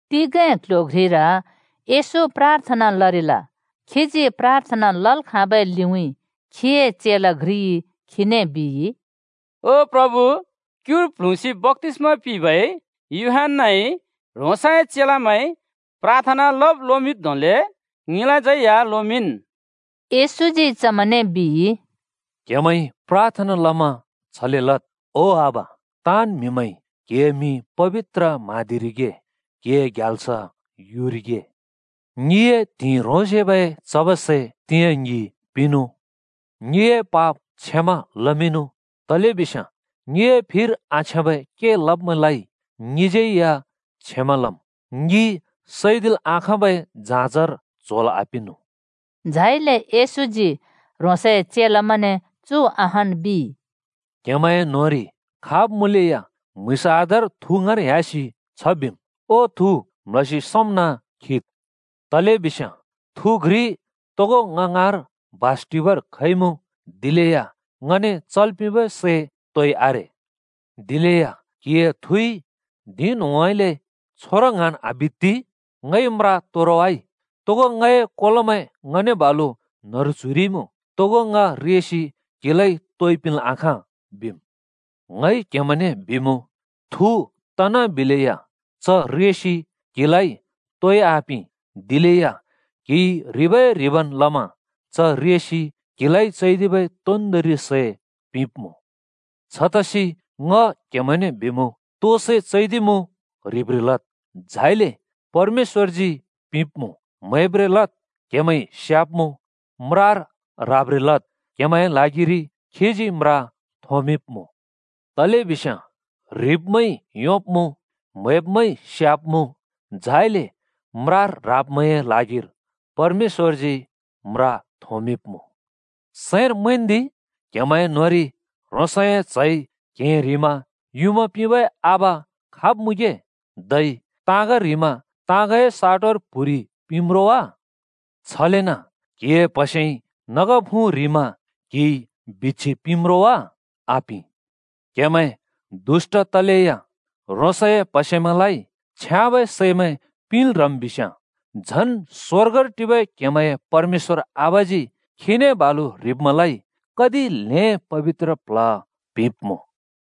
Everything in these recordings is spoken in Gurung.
तिगें क्‍ल्‍ह्‍यो घ्रिर येशू प्राथना लरिल। खीजी प्राथना लल् खाँबै लिउँइँ खीए चेला घ्रिइ खीने बिइ, “ओ प्रभु, क्युर प्ल्हुँसि बप्‍तिस्मा पिंबै यूहन्‍नाइ ह्रोंसए चेलामैं प्राथना लब् लोमिंब् धोंले ङिलाज्यै या लोमिंन्।” येशूजी चमैंने बिइ, “क्‍हेमैंइ प्राथना लमा छले लद्: ‘ओ आबा, ताँन् म्हिमैंइ क्हिए मिं पबित्र म्हाँदिरिगे, क्हिए ग्याल्स युरिगे, ङिए त्हिंइ ह्रोंसेबै चबै सै तिंयाँ ङि पिंनुँ। ङिए पाप क्षमा लमिंनु, तलेबिस्याँ ङिए फिर आछ्याँबै के लब्मैंलाइ ङिज्यै या ङि क्षमा लम्। ङि सैदिल् आखाँबै जाँजर च्होंल् आपिंनु।’” झाइले येशूजी ह्रोंसए चेलामैंने चु अहान् बिइ, “क्‍हेमैंए न्‍होंरि खाब् मुँलेया म्‍हुँइँस आधार थु ङाँर ह्‍यासि ‘ओ थु, म्‍ल्‍हसि सोंम्ना खिद्,’ बिम्। तलेबिस्याँ थु घ्रि तोगो ङ ङाँर बास टिबर खइमुँ, दिलेया ङने चल् पिंबै सै तोइ आरे। “दिलेया क्हिए थुइ धिं न्‍होंउँइँले ‘छोरो ङ्हाँन् आबित्ति। ङइ म्रा तोरवाइ। तोगो ङए कोलोमैं ङने बालु न्‍हरु च्‍हुइरिइमुँ। तोगो ङ रेसि क्‍हिलाइ तोइ पिंल् आखाँ,’ बिम्। “ङइ क्‍हेमैंने बिमुँ, थु तना बिलेया च रेसि क्हिलाइ तोइ आपिं, दिलेया क्‍हिइ ह्रिबै-ह्रिबन् लमा च रेसि क्‍हिलाइ चैदिबै तोन्दोंरि सै पिंब्‍मुँ। “छतसि ङ क्‍हेमैंने बिमुँ, तो सै चैदिमुँ ह्रिब्रें लद्, झाइले परमेश्‍वरजी पिंब्‍मुँ। म्‍हैब्रें लद् क्‍हेमैंइ स्याब्‍मुँ। म्रार ह्राब्रें लद् क्‍हेमैंए ल्हागिरि खीजी म्रा थोंमिंब्‍मुँ। तलेबिस्याँ ह्रिब्मैंइ योंब्‍मुँ, म्‍हैब्मैंइ स्याब्‍मुँ, झाइले म्रार ह्राब्मैंए ल्हागिर परमेश्‍वरजी म्रा थोंमिंब्‍मुँ। “सैंर मैंन्दि, क्‍हेमैंए न्‍होंरि ह्रोंसए च्‍हइ क्हें ह्रिमा युँमा पिंबै आबा खाब् मुँगे धै ताँग ह्रिमा ताँगए साटोर प्‍हुरि पिंम्‌ रो वा? छलेन क्‍हिए प्हसेइ नग फुँ ह्रिमा क्‍हिइ बिच्‍छि पिंम्‌ रो वा? आपिं! क्‍हेमैं दुष्‍ट तलेया ह्रोंसए प्हसेमैंलाइ छ्याँबै सैमैं पिंल् ह्रम् बिस्याँ, झन् स्‍वर्गर टिबै क्हेमैंए परमेश्‍वर आबाजी खीने बालु ह्रिब्मैंलाइ कति ल्हें पबित्र प्ल्ह पिंब्‍मुँ।”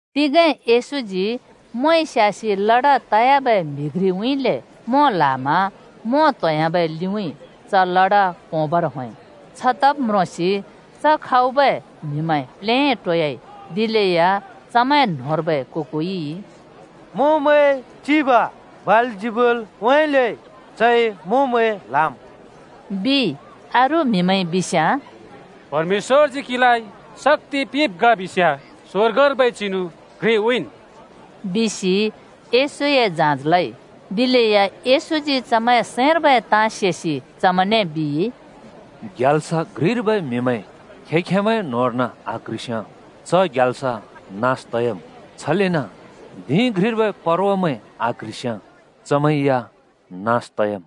तिगें येशूजी मोंइ स्यासि लड तयाबै म्‍हि घ्रिउँइँले मों ल्‍हामा मों त्होंयाबै लिउँइँ च लडा पोंबर होंइ। छ तब् म्रोंसि च खाउ मुँबै म्‍हिमैं प्लेटोयाइ। दिलेया चमैं न्होंर्बै को-कोइइ “मोंमैंए चिब बालजिबुलउँइँले चइ मोंमैं ल्‍हाम्,” बिइ। अरू म्हिमैंइ बिस्याँ “परमेश्‍वरजी क्‍हिलाइ शक्‍ति पिंब् ग बिस्याँ स्वर्गर्बै चिनु घ्रि उँइँन्,” बिसि येशूए जाँच लइ। दिलेया येशूजी चमैंए सैंर्बै ताँ सेसि चमैंने बिइ, “ग्याल्स घ्रिर्बै म्‍हिमैं खें-खेंमैंए न्होंर्न आक्ह्रिस्‍याँ च ग्याल्स नास तयाम्। छलेन धिं घ्रिर्बै परवामैं आक्‍ह्रिस्‍याँ चमैं या नास त‍याम्।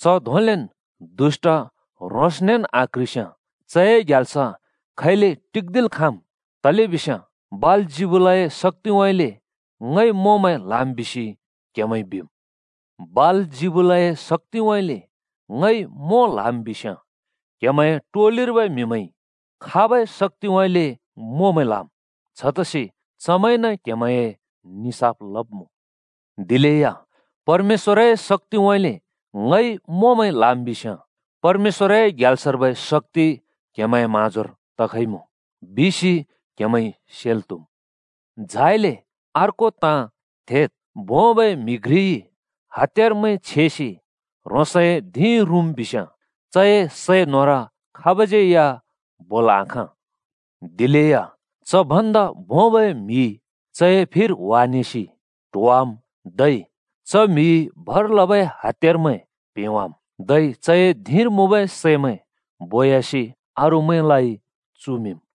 च धोंलेन् दुष्‍ट ह्रोंसनेन् आक्ह्रिस्याँ चए ग्याल्स खैले टिक्दिल् खाँम्? “तलेबिस्याँ बालजिबुलए शक्‍तिउँइँले ङइ मोंमैं ल्‍हाम् बिसि क्हेमैंइ बिम्। बालजिबुलए शक्‍तिउँइँले ङइ मों ल्‍हाम् बिस्‍याँ, क्‍हेमैंए टोलिर्बै म्‍हिमैंइ खाबै शक्‍तिउँइँले मोंमैं ल्‍हाम्? छतसि चमैंइन क्‍हेमैंए निसाफ लब्मुँ। दिलेया परमेश्‍वरए शक्‍तिउँइँले ङइ मोंमैं ल्‍हाम् बिस्याँ, परमेश्‍वरए ग्याल्स‍र्बै शक्‍ति क्‍हेमैंए म्‍हाँजोर तखइमुँ बिसि क्‍हेमैंइ सेल् त्‍हुम्। “झाइले अर्को ताँ थेद्! भोंबै म्‍हि घ्रिइ हत्‍यारमैं छेसि ह्रोंसए धिं रुँम् बिस्याँ चए सै न्होर खाबज्‍यै या बोल् आखाँ। दिलेया च भन्दा भोंबै म्‍हि चए फिर ह्‍वानेसि ट्वाहोवाम्, धै च म्‍हिइ भर लबै हत्‍यारमैं प्‍हेंवाम्, धै चए धिंर मुँबै सैमैं बोयासि अरूमैंलाइ चुमिंम्।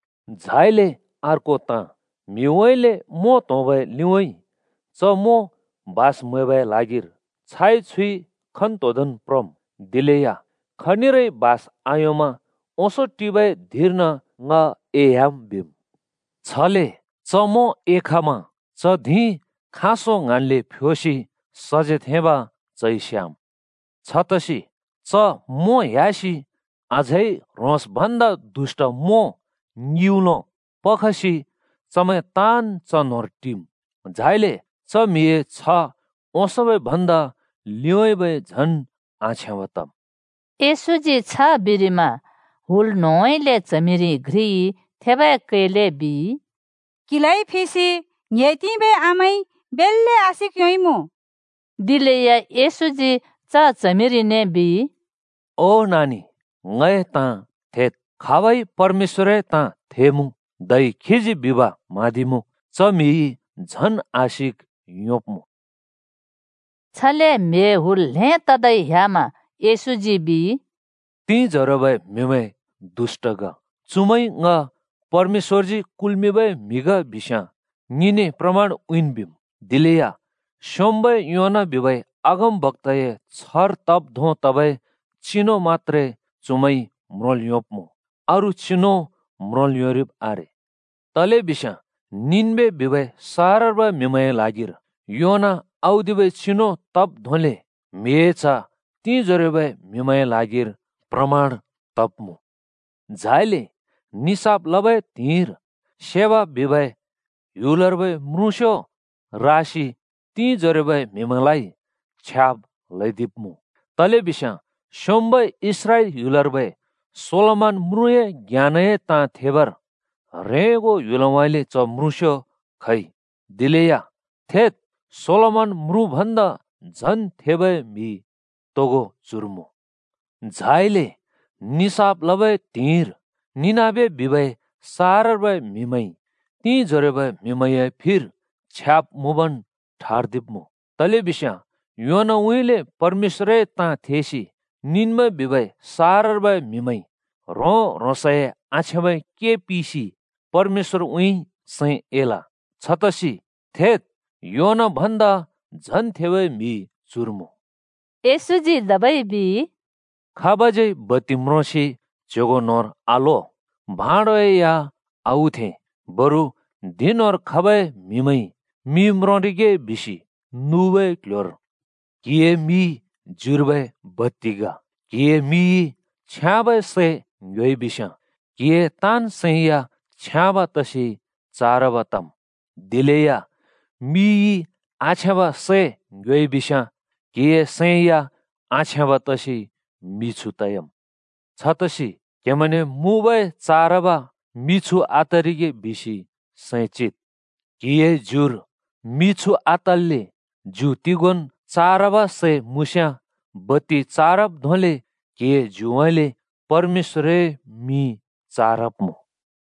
“झाइले अर्को ताँ: म्हिउँइँले मों त्‍होंबै लिउँइँ च मों बास म्‍हैबै ल्हागिर छाइ छुइ खन्तोंदोंन् प्रम्। दिलेया खनिरै बास आयोंमा ‘ओंसों टिबै धिंर्न ङ एह्‍याम्,’ बिम्। “छले च मों एखमा च धिं खाँसों ङ्हाँन्ले फ्योसि सजेथेंब् चइ स्याम्। छतसि च मों ह्‍यासि अझै ह्रोंस् भन्दा दुष्‍ट मों ङिउँलो पखसि चमैं ताँन् च न्होंर टिम्। झाइले च म्‍हिए छ्ह ओंसोंबै भन्दा लिउँइँबै झन् आछ्याँब तम्।” येशूजी छ बिरिमा हुल न्‍होंउँइँले च्हमिरि घ्रिइ थेबै कैले बिइ, “क्‍हिलाइ फिसि ङ्‍हे तिंबै आमाइ बेल्‍ले आशिक योंइमुँ।” दिलेया येशूजी च च्हमिरिने बिइ, “ओ नानि, ङए ताँ थेद्! परमेश्‍वरए ताँ थेसि खीजी बिब् म्हाँदिबै म्‍हिइ झन् आशिक योंब्मुँ।” छले म्हिए हुल् ल्हें तदै ह्‍यामा येशूजी बिइ, “तिंजोरोबै म्‍हिमैं दुष्‍ट ग। चुमैंइ ङ परमेश्‍वरजी कुल्‍मिंबै म्हि ग बिस्याँ ङिने प्रमाण उँइँन् बिम्। दिलेया स्‍योंम्‍बै योना बिबै अगमबक्‍ताए छ्हर तब् धों तबै चिनु मत्‍त्रे चुमैंइ म्रोंल योंब्मुँ, अरू चिनु म्रोंल् योंरिब् आरे। तलेबिस्याँ निनबे बिबै सहरर्बै म्‍हिमैंए ल्हागिर योना औदिबै चिनु तब् धोंले म्हिए च्ह तिंजोरोबै म्‍हिमैंए ल्हागिर प्रमाण तब्मुँ। झाइले निसाफ लबै त्हिंइर शेबा बिबै ह्‍युलर्बै म्रुँस्‍यो रासि तिंजोरोबै म्हिमैंलाइ छ्याब् ल्‍हैदिब्‍मुँ, तलेबिस्याँ स्‍योंम्‍बै इस्राएल ह्‍युलर्बै सोलोमन म्रुँए ज्ञानए ताँ थेबर ह्रेंगो ह्‍युलउँइँले च म्रुँस्‍यो खइ। दिलेया थेद्! सोलोमन म्रुँ भन्दा झन् थेबै म्‍हि तोगो चुर मुँ। झाइले निसाफ लबै त्हिंइर निनबे बिबै सहरर्बै म्‍हिमैंइ तिंइजोरोबै म्‍हिमैंए फिर छ्याब् मुँबन् ठर्दिब्‍मुँ, तलेबिस्याँ योनाउँइँले परमेश्‍वरए ताँ थेसि निनबे बिबै सहरर्बै म्‍हिमैंइ ह्रों-ह्रोंसए आछ्याँबै के पिसि परमेश्‍वरउँइँ सैं एल। छतसि थेद्! योना भन्दा झन् थेबै म्‍हि चुर मुँ।” येशूजी धबै बिइ, “खाबज्‍यै या बत्ति म्रोसि च्‍ह्‍योगों न्होंर आलो, मतलब भाँडोइ आउथें, बरु धिं न्‍होंर खबै म्‍हिमैंइ मि म्रोंरिगे बिसि नुबै क्‍ल्‍ह्‍योर थेंम्। क्‍हिए मि ज्युर्बै बत्ति ग। क्‍हिए मिइ छ्याँबै सै ङ्‍ह्‍योइ बिस्‍याँ क्‍हिए सैं या छ्याँब तसि चारब तम्। दिलेया मिइ आछ्याँब सै ङ्‍ह्‍योइ बिस्‍याँ क्‍हिए सैं या आछ्याँब तसि मिछु तयाम्। छतसि क्‍हेमैंने मुँबै चारब मि मिछु आतरिगे बिसि सैं चिद्। क्‍हिए ज्युर मिछु आतल्‍ले ज्यु तिगोंन् चारब सै मुँस्‍याँ बत्ति चारब धोंले क्‍हिए ज्युउँइँले परमेश्‍वर‍ए मिं चारब्मुँ।”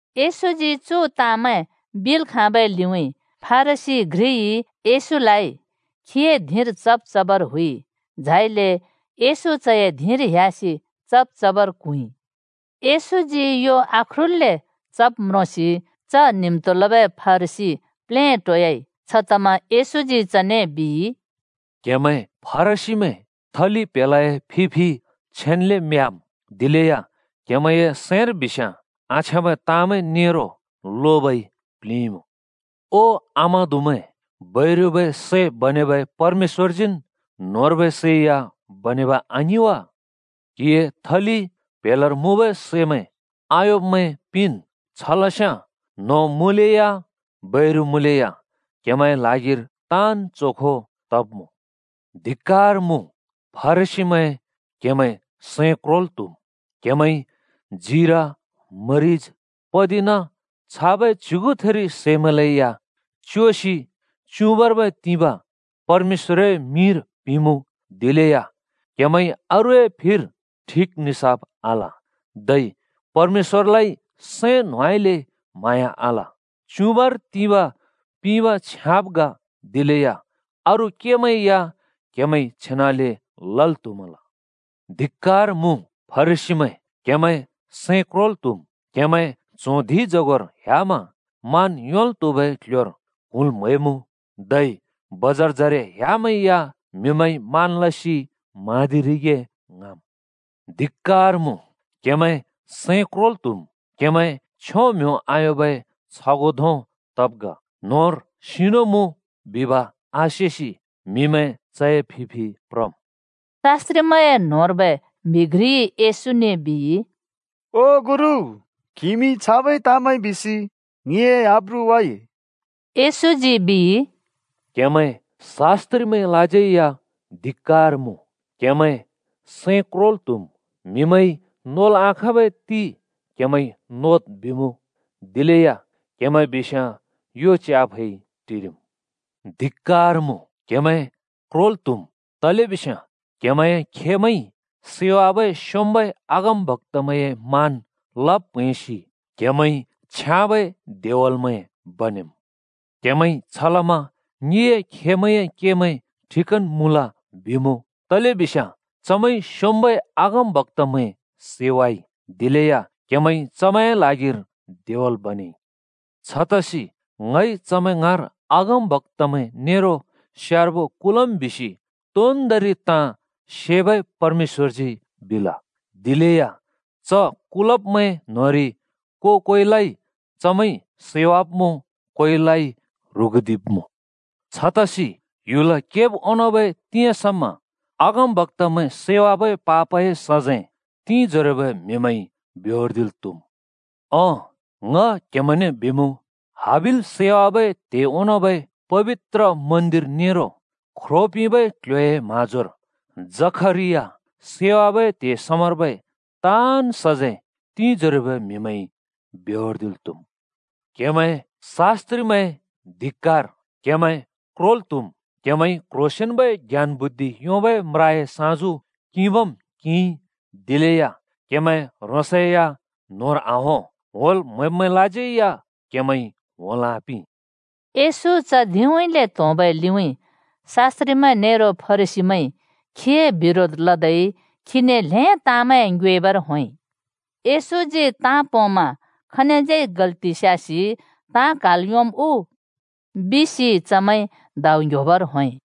येशूजी चु ताँमैं बिल् खाँबै लिउँइँ फरिसी घ्रिइ येशूलाइ खीए धिंर चब् चबर हुइ। झाइले येशू चए धिंर ह्‍यासि चब् चबर क्हुँइ। येशूजी यो आख्रुल्‍ले चब् म्रोंसि च न्हिम्तो लबै फरिसी प्लेटोयाइ। छतमा येशूजी चने बिइ, “क्‍हेमैं फरिसीमैं थलि प्‍हेलाए फि-फि छेन्‍ले म्याम्। दिलेया क्हेमैंए सैंर बिस्याँ आछ्याँबै ताँमैं नेरो लोबइ प्‍लिंइमुँ।” “ओ, आमादुमैं! बैरुबै सै बनेबै परमेश्‍वरजीन् न्‍होंर्बै सै या बनेब आङिं वा? क्‍हिए थलि प्‍हेलार मुँबै सैमैं आयोंब्मैं पिंन्। छ लस्याँ न्‍हों मुँलेया बैरु मुँलेया क्‍हेमैंए ल्हागिर ताँन् चोखो तब्‍मुँ। “धिक्‍कार मुँ फरिसीमैं क्हेमैं सैं क्रोल् त्‍हुम्! क्‍हेमैंइ जिरा-मरिज पतिना छाबै च्‍युगुथिर सैमैंलै या च्‍योसि च्‍युबाँर्बै तिबाँ परमेश्‍वरए मिंर पिंमुँ, दिलेया क्‍हेमैंइ अरूए फिर ठिक निसाफ आल, धै परमेश्‍वरलाइ सैं न्होंउँइँले म्‍हाँया आल। च्‍युबाँर तिबाँ पिंब छ्याँब ग, दिलेया अरू केमैं या क्हेमैंइ छेनाले लल् त्‍हुमल। “धिक्‍कार मुँ फरिसीमैं क्‍हेमैं सैं क्रोल् त्‍हुम्! क्‍हेमैं च्हों धिंजगोर ह्‍यामा मान योंल् त्हुबै क्‍ल्‍ह्‍योर क्हुँल् म्‍हैमुँ! धै बजारजरे ह्‍यामै या म्‍हिमैंइ मान लसि म्हाँदिरिगे ङ्हाँम्। “धिक्‍कार मुँ क्‍हेमैं सैं क्रोल् त्‍हुम्! क्‍हेमैं छ्यों म्ह्‍यों आयोंबै छगों धों तब् ग, ‘न्‍होंर सिनु मुँ’ बिब आसेसि म्हिमैं च‍ए फिफि प्रम्।” शास्‍त्रिमैंए न्होंर्बै घ्रिइ येशूने बिइ, “ओ गुरु, क्हिइमि छाबै ताँमैं बिसि ङिए आब्रु वाइ।” येशूजी बिइ, “क्हेमैं शास्‍त्रिमैंलाज्यै या धिक्‍कार मुँ! सैं क्रोल् त्‍हुम्! म्हिमैंइ नोल् आखाँबै ते क्‍हेमैंइ नोद् बिमुँ, दिलेया क्हेमैं बिस्याँ यो च्याफै टिरिम्। “धिक्‍कार मुँ, क्‍हेमैं क्रोल् त्‍हुम्! तलेबिस्याँ क्‍हेमैंए खेमैंइ सैवाबै स्योंम्बै अगमबक्‍तामैंए मान लब् प्हैंसि क्हेमैंइ छ्याँबै देवलमैं बनेमुँ। क्‍हेमैंइ छलमा ‘ङिए खेमैंए केमैं ठिकन् मुँल,’ बिमुँ। तलेबिस्‍याँ चमैंइ स्‍योंम्‍बै अगमबक्‍तामैं सैवाइ, दिलेया क्हेमैंइ चमैंए ल्हागिर देवल बनेइ। छतसि ‘ङइ चमैं ङाँर अगमबक्‍तामैं नेरो स्यार्बो कुलम्,’ बिसि तोन्दोंरि ताँ सेबै परमेश्‍वरजी बिल। ‘दिलेया च कुलब्‍मैं न्‍होंरि को‍-कोइलाइ चमैंइ सैवाब्‍मुँ, कोइलाइ ह्रुगुदिब्‍मुँ।’ छतसि ह्‍युल केब् ओंनोंबै तिंयाँ समा अगमबक्‍तामैं सैवाबै पापए सजैं तिंजोरोबै म्हिमैंइ बेहोर्दिल् त्‍हुम्। ओं, ङ क्हेमैंने बिमुँ, हाबिल सैवाबै त्हे ओंनोंबै पबित्र मन्दिर नेरो ख्रो पिंबै क्ल्ह्‍योए म्हाँजोर जखरिया सैवाबै त्हे समार्बै ताँन् सजैं तिंजोरोबै म्‍हिमैंइ बेहोर्दिल् त्‍हुम्। “क्‍हेमैं शास्‍त्रिमैं धिक्‍कार क्हेमैं क्रोल् त्‍हुम्! क्‍हेमैंइ क्‍ह्रोसेंन्‍बै ज्ञान बुद्धि योंबै म्राए साँजु किंबम् किंइ, दिलेया क्‍हेमैं ह्रोंसै या न्होंर आहों, होंल् म्‍हैब्मैंलाज्यै या क्‍हेमैंइ होंल् आपिं।” येशू च धिंउँइँले त्‍होंबै लिउँइँ शास्‍त्रिमैं नेरो फरिसीमैंइ खीए बिरोध लदै खीने ल्‍हें ताँमैं ङ्योएबर होंइ। “येशूजी ताँ पोंमा खनिज्यै गल्‍ति स्यासि ताँ क्हाल् योंम् उ?” बिसि चमैंइ दाउ ङ्‍ह्‍योबर होंइ।